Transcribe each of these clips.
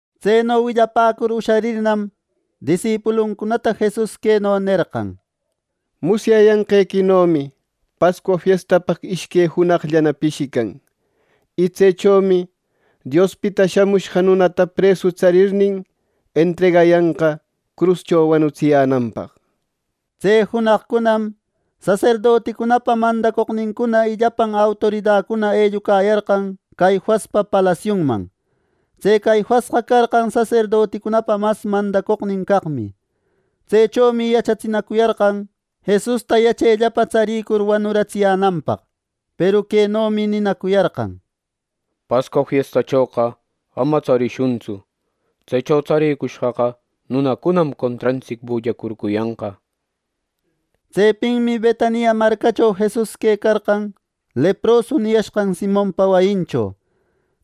Tseno willapäcur usharirnam, disipuluncunata Jesus queno nerqan: —Musyayanqequinomi Pascua fiestapaq ishque junaqllana pishican. Y tsechomi Diospita Shamushqa Nunata presu tsarirnin, entregayanqa cruscho wanutsiyänanpaq —nir. Tse junaqcunam saserdoticunapa mandacoqnincuna y llapan autoridacuna ellucayarqan Caifaspa palasiunman. Tse Caifasqa carqan saserdoticunapa mas mandacoqnin caqmi. Tsechomi yachatsinacuyarqan Jesusta yachellapa tsarïcur wanuratsiyänanpaq. Peru quenomi ninacuyarqan: —Pascua fiestachoqa ama tsarishuntsu. Tsecho tsarïcushqaqa nunacunam contrantsic bullacurcuyanqa —nir. Tsepinmi Betania marcacho Jesus quecarqan, leprosu niyashqan Simonpa wayincho.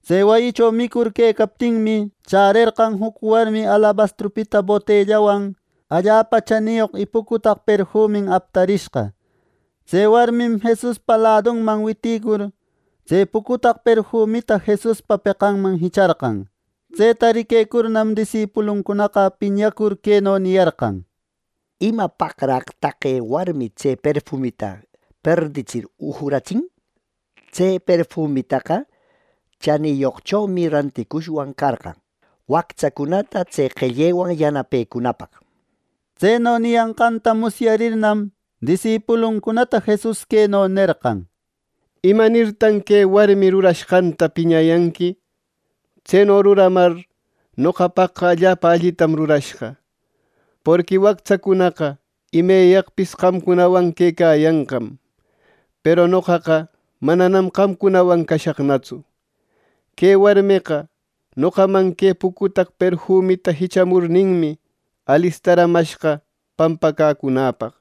Tse wayicho micur tëcaptinmi, chärerqan juc warmi alabastrupita botellawan allapa chaniyoq y pucutaq perfumin aptarishqa. Tse warmim Jesuspa ladunman witïcur, tse pucutaq perfumita Jesuspa peqanman jicharqan. Tseta riquecurnam, disipuluncunaqa piñacur queno niyarqan: —¿Imapaqraq taqe warmi tse perfumita perditsir ujuratsin? Tse perfumitaqa chaniyoqchomi ranticushwan carqan wactsacunata tse qellewan yanapecunapaq —nir. Tseno niyanqanta musyarirnam, disipuluncunata Jesus queno nerqan: —¿Imanirtan que warmi rurashqanta piñayanqui? Tseno ruramar noqapaqqa allapa allitam rurashqa. Porqui wactsacunaqa imeyaqpis qamcunawanmi quecayanqa. Peru noqaqa mananam qamcunawan cashaqnatsu. Que warmeqa noqaman que pucutaq perfumita jichamurninmi, alistaramashqa pampacäcunäpaq.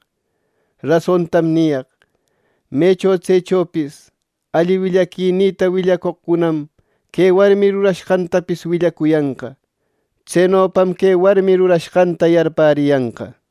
Rasontam niyaq: Mecho tsechopis alli willaquinïta willacoqcunam que warmi ruranqantapis willacuyanqa. Tsenopam que warmi rurashqanta yarpäriyanqa.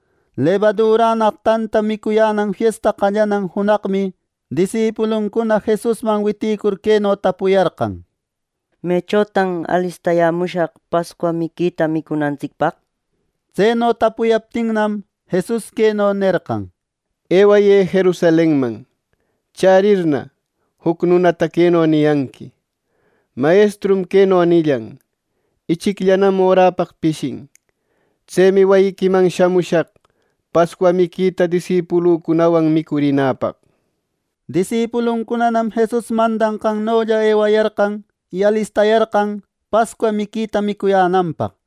Lebadurannaq tantata micuyänan fiesta qallanan junaqmi disipuluncuna Jesusman witïcur queno tapuyarqan: —¿Mechotan alistayämushaq Pascua miquita micunantsicpaq? —nir. Tseno tapuyaptinnam, Jesus queno nerqan: —Ewayë Jerusalenman. Chärirna, juc nunata queno niyanqui: ‘Mayestrum queno nillan: “Ichicllanan oräpaq pishin. Tsemi wayiquiman shamushaq Pascua miquita disipulücunawan micurinäpaq.” ’ Disipuluncunanam Jesus mandayanqannolla ewayarqan. Y alistayarqan Pascua miquita micuyänanpaq.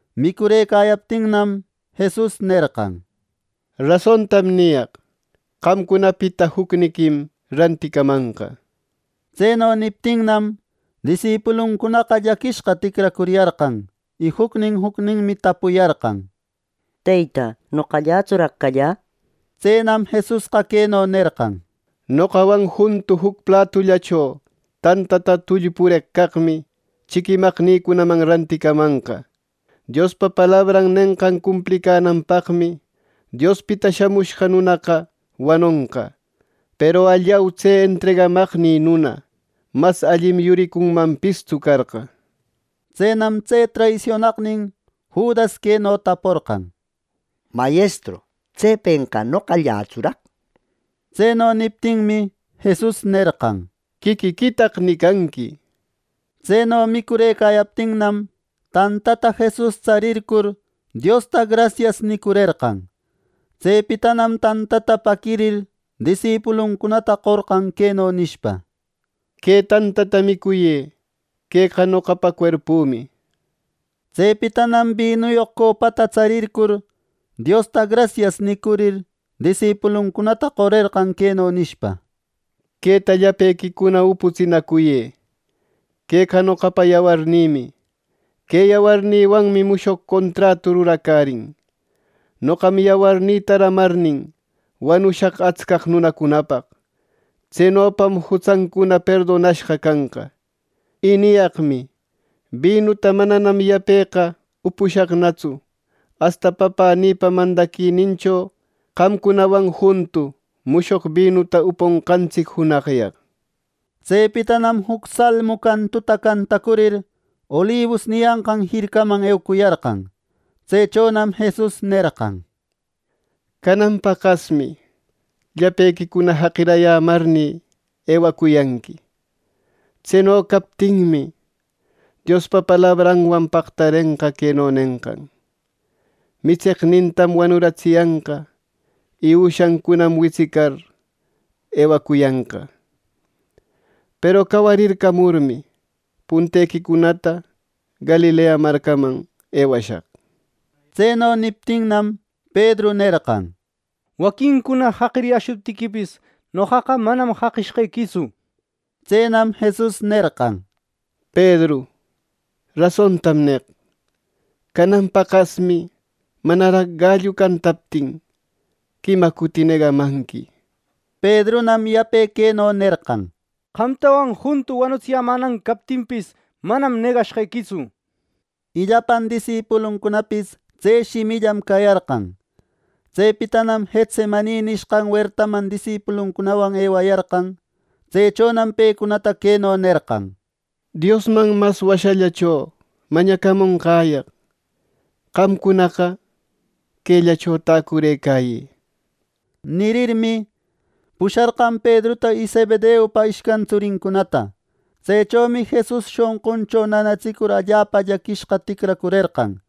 Micurëcayaptinnam, Jesus nerqan: —Rasontam niyaq: Qamcunapita jucniquim ranticamanqa. Tseno niptinnam, disipuluncunaqa llaquinashqa ticracuriyarqan, y jucnin jucninmi tapuyarqan: —¿Teyta, noqallätsuraq callä? —nir. Tsenam Jesusqa queno nerqan: —Noqawan juntu juc platullacho tantanta tullpureq caqmi chiquimaqnïcunaman ranticamanqa —nir. —Diospa palabran nenqan cumplinanpaqmi Diospita Shamushqa Nunaqa wanonqa; peru ¡allau, tse entregamaqnï nuna! Mas allim yuricunmanpistsu carqa —nir. Tsenam tse traisionaqnin Judas queno taporqan: —¿Mayestru, tsepenqa noqallatsuraq? —nir. Tseno niptinmi, Jesus nerqan: —¡Quiquiquitaq nicanqui! —nir. Tseno micurëcayaptinnam, tantata Jesus tsarircur Diosta “Grasias” nicurerqan. Tsepitanam tantata paquirir, disipuluncunata qorqan queno nishpa: —Que tantata micuyë. Queqa noqapa cuerpümi —nishpa. Tsepitanam binuyoq copata tsarircur, Diosta “Grasias” nicurir, disipuluncunata qorerqan queno nishpa: “Queta llapequi uputsinacuyë. —Queqa noqapa yawarnïmi. Que yawarnïwanmi mushoq contratu ruracärin. Noqam yawarnïta ramarnin, wanushaq atscaq nunacunapaq. Tsenopam jutsancuna perdonashqa canqa. Y niyaqmi: Bi nuta mananam yapeqa upushaqnatsu asta Papänïpa mandaquinincho qamcunawan juntu mushoq binuta uponqantsic junaqyaq” nir. Tsepitanam juc salmu cantuta cantacurir, Olibus niyanqan jircaman eucuyarqan. Tsechonam Jesus nerqan: —Canan paqasmi llapequicuna jaqiricayämarnï, ewacuyanqui. Tseno captinmi, Diospa palabranwan paqtarenqa queno nenqan: ‘Mitseqnintam wanuratsiyanqa y üshancunam witsicar, eucuyanqa’ nir. Peru cawarircamurmi, puntequicunata Galilea marcaman ewashaq. Tseno niptinnam, Pedru nerqan: —Waquincuna jaqiriyäshuptiquipis, noqaqa manam jaqishqequitsu —nir. Tsenam Jesus nerqan: —Pedru, rasontam neq: Canan paqasmi manaraq gallu cantaptin, quima cuti negamanqui —nir. Pedrunam yape queno nerqan: —Qamtawan juntu wanutsiyämänan captinpis, manam negashqequitsu —nir. Y llapan disipuluncunapis tse shimillam cayarqan. Tsepitanam Getsemani nishqan wertaman disipuluncunawan ewayarqan. Tsechonam pecunata queno nerqan: —Diosman mas washallacho mañacamunqäyaq, qamcunaqa quellacho täcurëcayë —nir. Nirirmi, pusharqan Pedruta y Zebedeupa ishcan tsurincunata. Tsechomi Jesus shonquncho nanatsicur allapa llaquishqa ticracurerqan.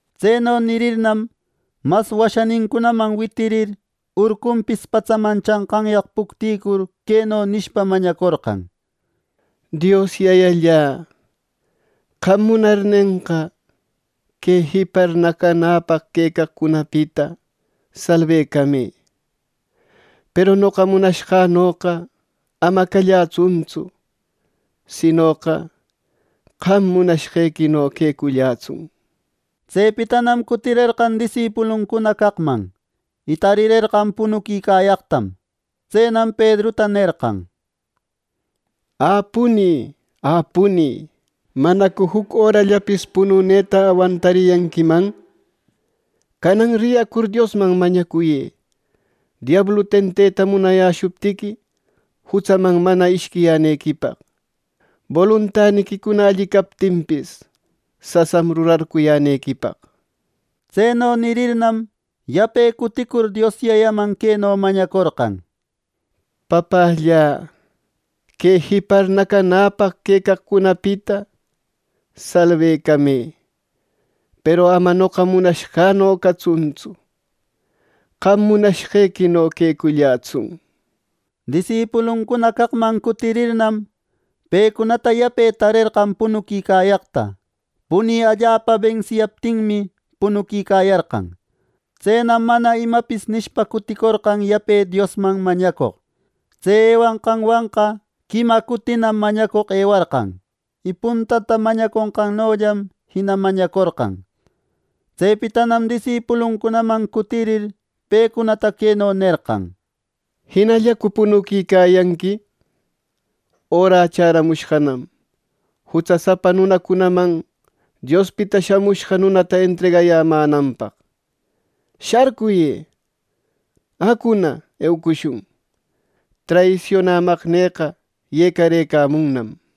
Tseno nirirnam, mas washanincunaman witirir, urcunpis patsaman chanqanyaq puctïcur queno nishpa mañacorqan: —Dios Yayallä, qam munarnenqa que jipar nacanäpaq quecaqcunapita salbecamë; peru noqa munashqänoqa ama callätsuntsu, sinoqa qam munashqequino quecullätsun —nir. Tsepitanam cutirerqan disipuluncuna caqman, y tarirerqan punuquicayaqtam. Tsenam Pedruta nerqan: —¿Ä punï, ä punï, manacu juc örallapis pununeta awantariyanquiman! Canan riyacur Diosman mañacuyë, diablu tenteta munayäshuptiqui, jutsaman mana ishquiyänequipaq. Boluntaniquicuna alli captinpis, sasam rurarcuyänequipaq —nir. Tseno nirirnam, yape cutïcur Dios Yayaman queno mañacorqan: —Papällä, que jipar nacanäpaq quecaqcunapita, salbecamë. Peru ama noqa munashqänoqa catsuntsu; qam munashqequino quecullätsun —nir. Disipuluncuna caqman cutirirnam, pecunata yape tarerqan punuquicayaqta; punï allapa bensiyaptinmi, punuquicayarqan. Tsenam mana imapis nishpa cuticorqan yape Diosman mañacoq. Tse ewanqanwanqa quima cutinam mañacoq ewarqan, y puntata mañaconqannollam jina mañacorqan. Tsepitanam disipuluncunaman cutirir pecunata queno nerqan: —¿Jinallacu punuquicayanqui? Örä chäramushqanam jutsasapa nunacunaman Diospita Shamushqa Nunata entregayänanpaq. Sharcuyë. Acuna, eucushun. Traisionämaqnïqa yecarëcamunnam —nir.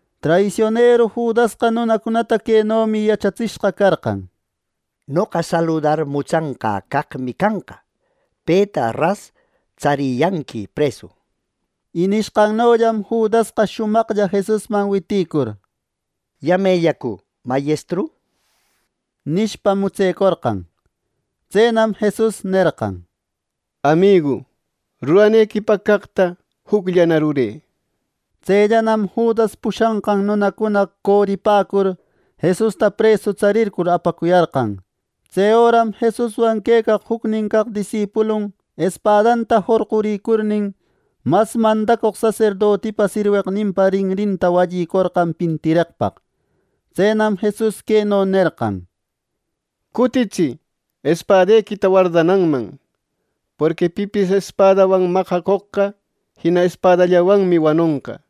Traisionero Judasqa nunacunata quenomi yachatsishqa carqan, “Noqa saludar mutsanqä caqmi canqa. Peta ras tsariyanqui presu” nir. Y nishqannollam Judasqa shumaqlla Jesusman witïcur “¿Yamellacu? Mayestru” nishpa, mutsecorqan. Tsenam Jesus nerqan: —Amigu, ruranequipaq caqta jucllana rurë —nir. Tsellanam Judas pushanqan nunacuna coripäcur Jesusta presu tsarircur apacuyarqan. Tse öram Jesuswan quecaq jucnin caq disipulun espadanta jorquricurnin, mas mandacoq saserdotipa sirweqninpa rinrinta wallicorqan pintireqpaq. Tsenam Jesus queno nerqan: —Cutitsï espadequita wardananman; porqui pipis espadawan maqacoqqa, jina espadallawanmi wanonqa.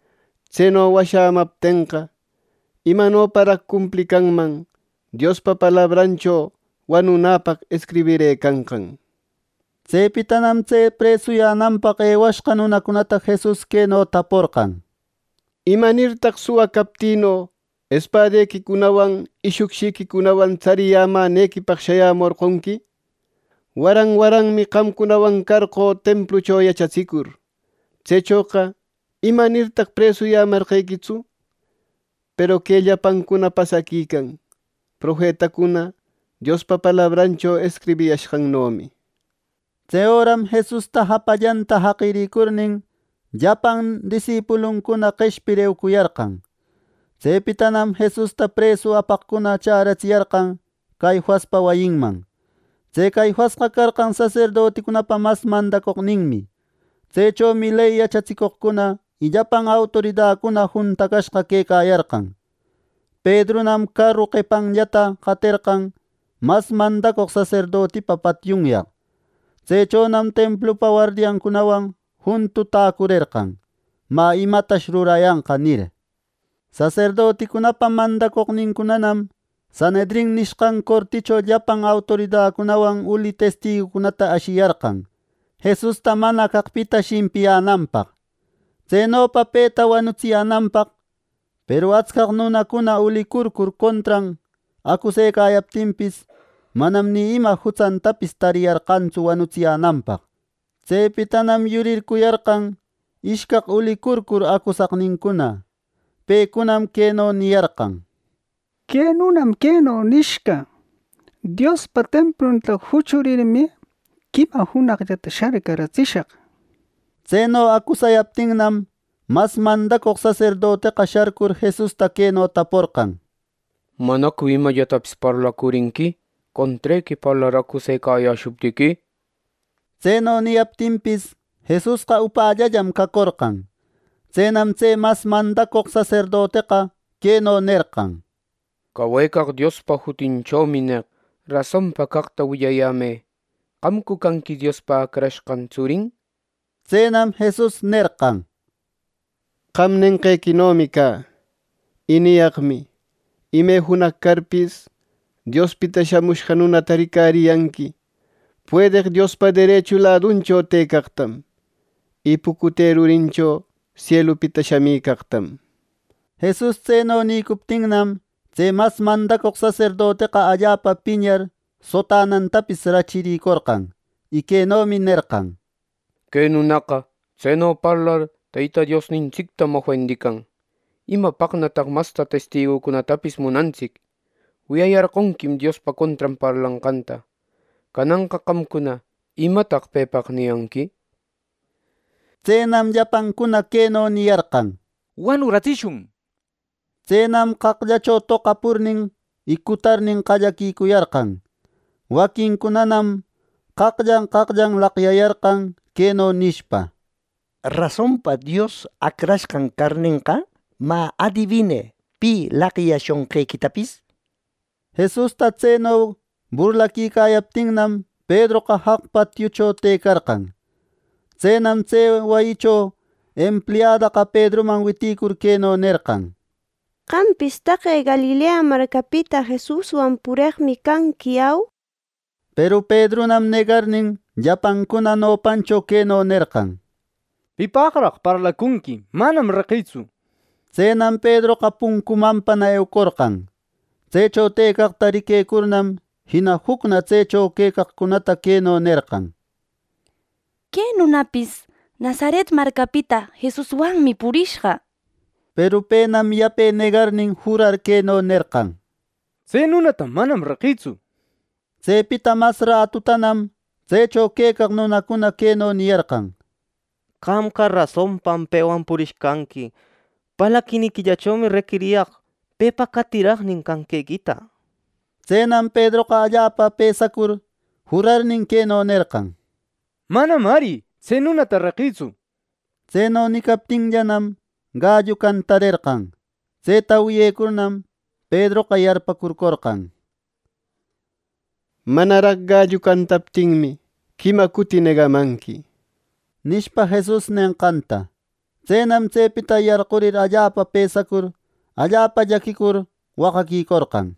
Tseno washäyämaptenqa, ¿Imanoparaq cumplicanman Diospa palabrancho wanunäpaq escribirëcanqan! —nir. Tsepitanam tse presuyänanpaq ewashqa nunacunata Jesus queno taporqan: —¿Imanirtaq suwa captïno espadequicunawan y shucshiquicunawan tsariyämänequipaq shayämorqonqui! Waran waranmi qamcunawan carqö templucho yachatsicur. Tsechoqa ¿imanirtaq presuyämarqequitsu! Peru que llapancuna pasaquican profetacuna Diospa palabrancho escribiyashqannomi —nir. Tse öram Jesusta japallanta jaqirïcurnin, llapan disipuluncuna qeshpir eucuyarqan. Tsepitanam Jesusta presu apaqcuna chäratsiyarqan Caifaspa wayinman. Tse Caifasqa carqan saserdoticunapa mas mandacoqninmi. Tsechomi ley yachatsicoqcuna y llapan autoridacuna juntacashqa quecayarqan. Pedrunam caru qepancunallata qaterqan mas mandacoq saserdotipa patiunyaq. Tsechonam templupa wardiancunawan juntu täcurerqan, “Mä, imatash rurayanqa” nir. Saserdoticunapa mandacoqnincunam Sanhedrin nishqan corticho llapan autoridacunawan uli testigucunata ashiyarqan Jesusta mana caqpita shimpiyänanpaq, tsenopa peta wanutsiyänanpaq. Peru atscaq nunacuna ulicurcur contran acusecayaptinpis, manam ima jutsantapis tariyarqantsu wanutsiyänanpaq. Tsepitanam yurircuyarqan ishcaq ulicurcur acusaqnincuna. Pecunam queno niyarqan: —Que nunam queno nishqa: ‘Diospa templunta juchurirmi, quima junaqllata sharcaratsishaq’ —nir. Tseno acusayaptinnam, mas mandacoq saserdoteqa sharcur Jesusta queno taporqan: —¿Manacu imallatapis parlacurinqui, contrequi parlar acusecayäshuptiqui? —nir. Tseno niyaptinpis, Jesusqa upällallam cacorqan. Tsenam tse mas mandacoq saserdoteqa queno nerqan: —Cawecaq Diospa jutinchomi neq: Rasonpa caqta willayämë. ¿Qamcu canqui Diospa Acrashqan tsurin? —nir. Tsenam Jesus nerqan: —Qam nenqequinomi cä. Y niyaqmi: ime junaq carpis, Diospita Shamushqa Nunata ricariyanqui puedeq Diospa derechu laduncho tëcaqtam, y pucute rurincho sielupita shamicaqtam. Jesus tseno nïcuptinnam, tse mas mandacoq saserdoteqa allapa piñar, sotanantapis rachiricorqan, y quenomi nerqan: —¡Que nunaqa tseno parlar Teyta Diosnintsictam ofendican! ¿Imapaqnataq mas testigucunatapis munantsic! Wiyayarqonquim Diospa contran parlanqanta. Cananqa qamcuna ¿Imataq pepaq niyanqui? —nir Tsenam llapancuna queno niyarqan: —¡Wanuratsishun! —nir. Tsenam qaqllacho toqapurnin y cutarnin, qallaquicuyarqan. Waquincunanam qaqllan qaqllan laqyayarqan, queno nishpa: —¿Rasonpa Dios Acrashqan carnenqa? Mä, adibinë, ¿pi laqyashonqequitapis? —nir. Jesusta tseno burlaquicayaptinnam, Pedroqa jaq patiucho tëcarqan. Tsenam tse wayicho empliadaqa Pedruman witïcur, queno nerqan: —Qampis taqe Galilea marcapita Jesuswan pureqmi canqui, ¿au? —nir. Peru Pedrunam negarnin, llapancuna nopancho queno nerqan: —Pipaqraq parlacunqui, manam reqïtsu —nir. Tsenam Pedroqa puncumanpana eucorqan. Tsecho quecaqta riquecurnam, jina jucna tsecho quecaqcunata queno nerqan: —Que nunapis Nazaret marcapita Jesuswanmi purishqa —nir. Peru penam yape negarnin jurar queno nerqan: —¡Tse nunata manam reqïtsu! —nir. Tsepita mas ratutanam tsecho quecaq nunacuna queno niyarqan: —Qamqa rasonpam pewan purishqanqui. Parlaquiniquillachomi reqiriyaq pepa qatiraqnin canqequita —nir. Tsenam Pedroqa allapa pësacur jurarnin queno nerqan: —¡Manam ari tse nunata reqïtsu! —nir. Tseno nicaptinllanam, gallu cantarerqan. Tseta wiyecurnam Pedroqa yarpäcurcorqan, “Manaraq gallu cantaptinmi, quima cuti negamanqui” nishpa, Jesus nenqanta. Tsenam tsepita yarqurïcur allapa pësacur, allapa llaquicur, waqaquicorqan.